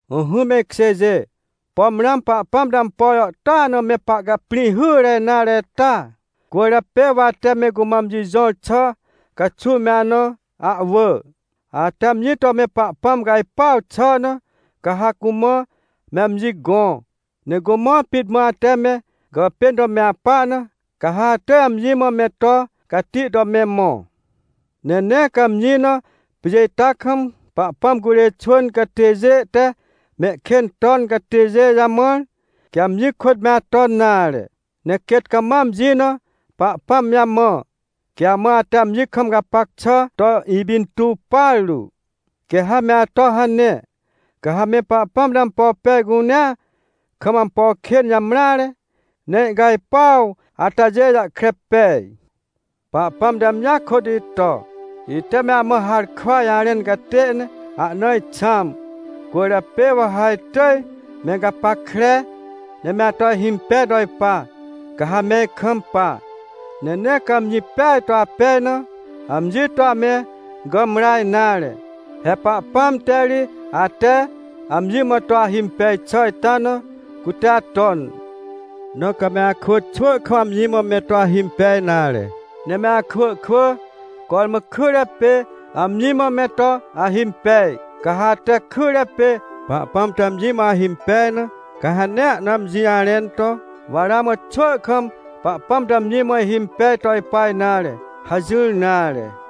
Ỹhỹ me ikjêjê, pom ramã Pahpãm te ampo jàhtôa na me pahcaprĩ hyre nare ita? Cwỳrjapê wa ate me cumã amji jõr xà caxuw me ana ahwỳ. Ate amji to me Pahpãm cajpuaw xà na, ca ha cumã me amji gõ, ne cumã pit mã ate me gàpên to me apa na, ca ha atỳj amji mã me to cati to me mõ. Ne nee ca ha amji na pjê ita kam, Pahpãm curê xwỳn catêjê te mehkên ton catêjê jamãr, quê amji kôt me aton nare. Ne quêt cama amji na Pahpãm jamã, quê amã ate amji kam gapac xà to ipintuw partu. Quê ha me ato hane, ca ha me Pahpãm te ampo pej cunea, kam ampo kên jamreare, ne ihcajpuaw atajê jahkre pej. Pahpãm te amjia kôt ito, ite me amã harkwa jarẽn catê ne ahna ixãm. Cwỳrjapê wa ha itỳj me gapackre, ne me ato ihimpej to ipa, ca ha me ikampa. Ne nee ca amji peaj to apej na, amji to ame gàmra nare. He Pahpãm te ri ate amji mã to ahimpej xà ita na cute aton. Na ca me akwỳ, xwỳ kam amji mã me to ahimpej nare, ne me akwỳ kwỳ, cormã kyre pê amji mã me to ahimpej. Ca ha ate kyre pê Pahpãm to amji mã ahimpej na, ca ha nee ahna amji jarẽn to: — Wa ramã xwỳ kam Pahpãm to amji mã ihimpej to ipa nare — hajỹr nare.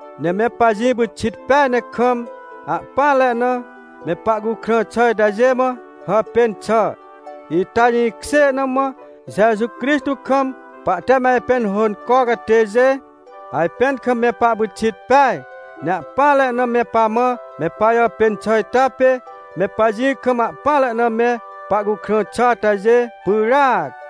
Ne me pajĩ pyxit peaj ne kam, ahpỹanre na, me pahcukrã xà itajê mã hàpên xà. Ita jĩkjê na mã Jeju Crixtô kam pahte me ajpẽn hônco catêjê, ajpẽn kam me pahpyxit peaj. Ne ahpỹanre na me pamã me pajàpên xà ita pê me pajĩ kam ahpỹanre na me pahcukrã xà atajê pyràac.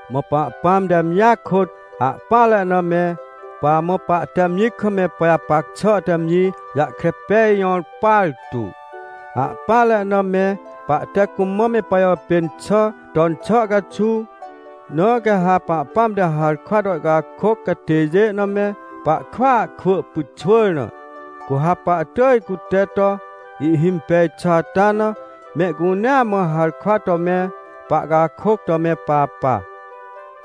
Mã Pahpãm te amjia kôt ahpỹanre na me pamã pahte amji kam me pajapac xà te amji jahkre pej jõr partu, ahpỹanre na me pahte cumã me pajàpên xà ton xà caxuw. Na quê ha Pahpãm te harkwa to ihcakôc catêjê na me pahkwỳa kwỳ pyxwỳr na, cu ha pahtỳj cute to ihhimpej xà ata na mehcunea mã harkwa to me pahcakôc to me papa.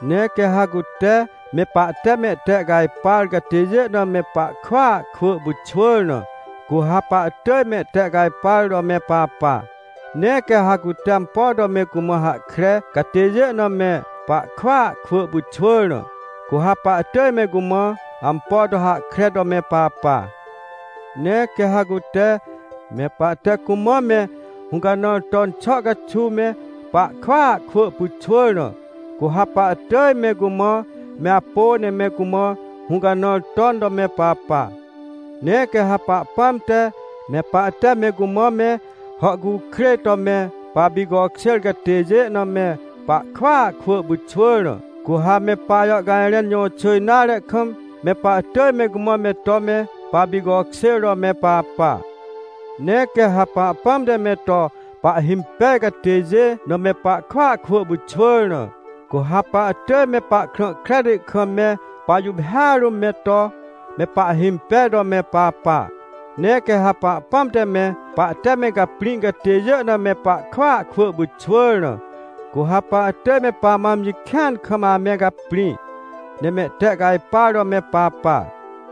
Ne quê ha cute me pahte mehtehcajpar catêjê na me pahkwỳa kwỳ pyxwỳr na, cu ha pahtỳj mehtehcajpar to me papa. Ne quê ha cute ampo to me cumã hahkre catêjê na me pahkwỳa kwỳ pyxwỳr na, cu ha pahtỳj me cumã ampo to hahkre to me papa. Ne quê ha cute, me pahte cumã me hũcanãr ton xà caxuw me pahkwỳa kwỳ pyxwỳr na, cu ha pahtỳj me cumã me apô ne me cumã hũcanãr ton to me papa. Ne quê ha Pahpãm te, me pahte me cumã me hàhcukrêj to me papicokjêr catêjê na me pahkwỳa kwỳ pyxwỳr na, cu ha me pajàhcajrẽn jõxỳ nare kam, me pahtỳj me cumã me to me papicokjêr to me papa. Ne quê ha Pahpãm te me to pahhimpej catêjê na me pahkwỳa kwỳ pyxwỳr na, cu ha pahtỳj me pahkrã kreti kam me pajuphêa rũm me to me pahhimpej to me papa. Ne quê ha Pahpãm te me pahte me caprĩ catêjê na me pahkwỳa kwỳ pyxwỳr na, cu ha pahtỳj me pamã amji kĩan kam ame caprĩ, ne mehtehcajpar to me papa.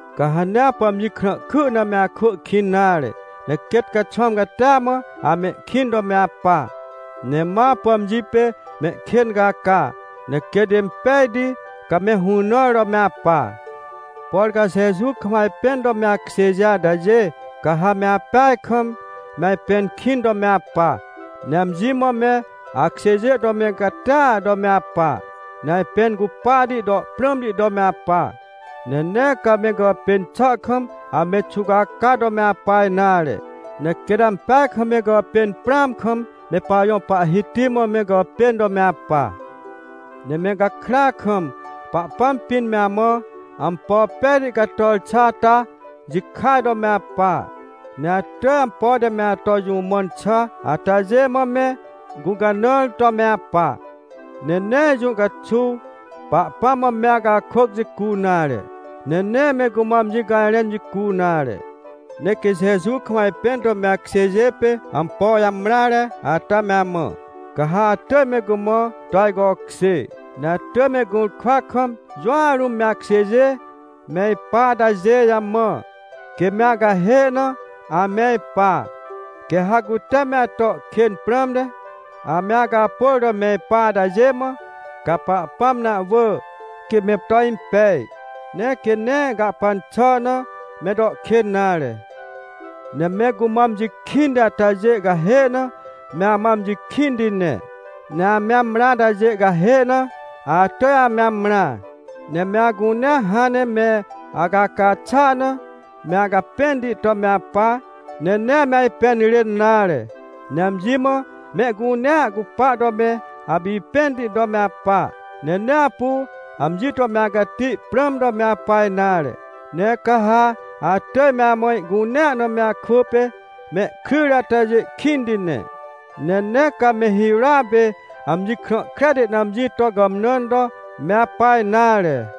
Ca ha nee apu amji krãhky na me akwỳ kĩn nare, ne quêt caxwãm catia mã amehkĩn to me apa. Ne ma apu amji pê mehkên caca, ne quêt impejti ca me hũnãr to me apa. Por ca Jeju kam ajpẽn to me akjêjê atajê, ca ha me apeaj kam, me ajpẽn kĩn to me apa. Ne amji mã me akjêjê to me catia to me apa, ne ajpẽn cupahti to prãmti to me apa. Ne nee ca me gàpên xà kam ame xuwcaca to ame apa nare, ne quêt ampeaj kam me gàpên prãam kam me pajõ Pahhiti mã me gàpên to me apa. Ne me gakrya kam, Pahpãm pĩn me amã ampo pejti cator xà ata jikaj to me apa. Ne atỳj ampo te me ato jũ mãn xà atajê mã me gũcanãr to me apa. Ne nee jũ caxuw Pahpãm mã me acakôc jicu nare, ne nee me cumã amji cajrẽn jicu nare. Ne quê Jeju kam ajpẽn to me akjêjê pê ampo jamreare ata me amã, ca ha atỳj me cumã to ajcokjê. Ne atỳj me gũrkwa kam jũa rũm me akjêjê me ipa atajê jamã, quê me acahê na ame ipa. Quê ha cute me ato kên prãmte, ame acapôr to me ipa atajê mã, ca Pahpãm na ahwỳ, quê me to impej, ne quê nee gahpan xà na ame to kên nare. Ne me cumã amji kĩnti atajê cahê na me amã amji kĩnti ne. Ne ame amrã atajê cahê na atỳj ame amrã. Ne me acunea hãn ne me acaca xà na, me acapẽnti to me apa, ne nee ame ajpẽn rên nare. Ne amji mã mehcunea cupa to me apipẽnti to me apa. Ne nee apu amji to me acati prãm to me apa nare. Ne ca ha atỳj me amã ihcunea na me akwỳ pê mehkryjre atajê kĩnti ne. Ne nee ca me hirôa pê amji krã kreti na amji to gàmnãn to me apa nare.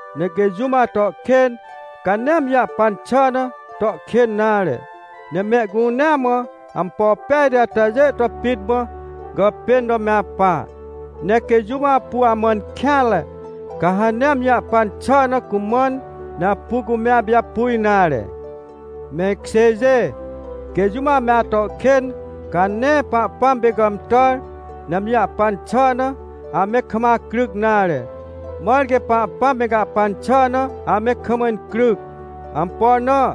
Ne quê jũm ato kên, ca nee amji jahpan xà na to kên nare. Ne mehcunea mã ampo pejti atajê to pit mã gàpên to me apa. Ne quê jũm apu amãn kêanre, ca ha nee amji jahpan xà na cumãn, ne apu cume apijapu nare. Me ikjêjê, quê jũm ame ato kên, ca nee Pahpãm pê gàmtàr, ne amji jahpan xà na ame kam acryc nare. Mãr quê Pahpãm me gahpan xà na ame kam incryc. Ampo na?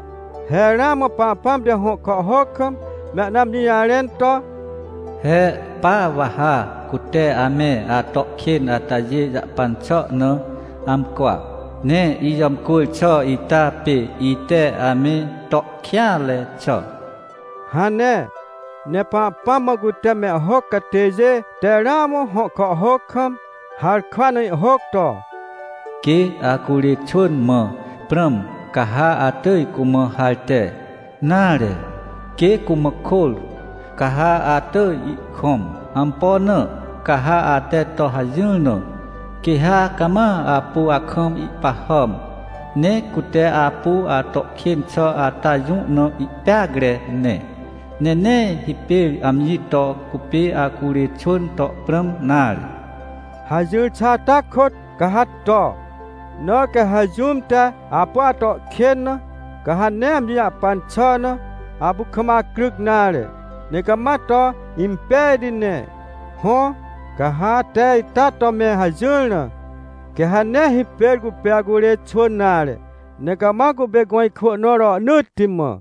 He ramã Pahpãm te hõ kàhhôc kam me ahna amji jarẽn to: “He pa wa ha cute ame ato kên atajê jahpan xà na amcwa, ne ijàmcwỳr xà ita pê ite ame to kêanre xà” hane. Ne Pahpãm mã cute mehhôc catêjê te ramã hõ kàhhôc kam, harkwa na ihhôc to: “Quê acurê xwỳn mã prãm, ca ha atỳj cumã harte, nare, quê cumã kôr, ca ha atỳj ihkõm. Ampo na? Ca ha ate to hajỹr na, quê ha cama apu akam ihpahàm, ne cute apu ato kên xà ata jũ na ihpeacre ne, ne nee hipêr amji to cupê acurê xwỳn to prãm nare” hajỹr xà ata kôt, ca ha to. Na quê ha jũm te apu ato kên na, ca ha nee amji jahpan xà na apu kam acryc nare, ne cama to impejti ne. Hõ, ca ha ate ita to me hajỹr na, quê ha nee hipêr cupê acurê xwỳn nare, ne cama cupê gõ ikwỳ nõ rohnỳtti mã.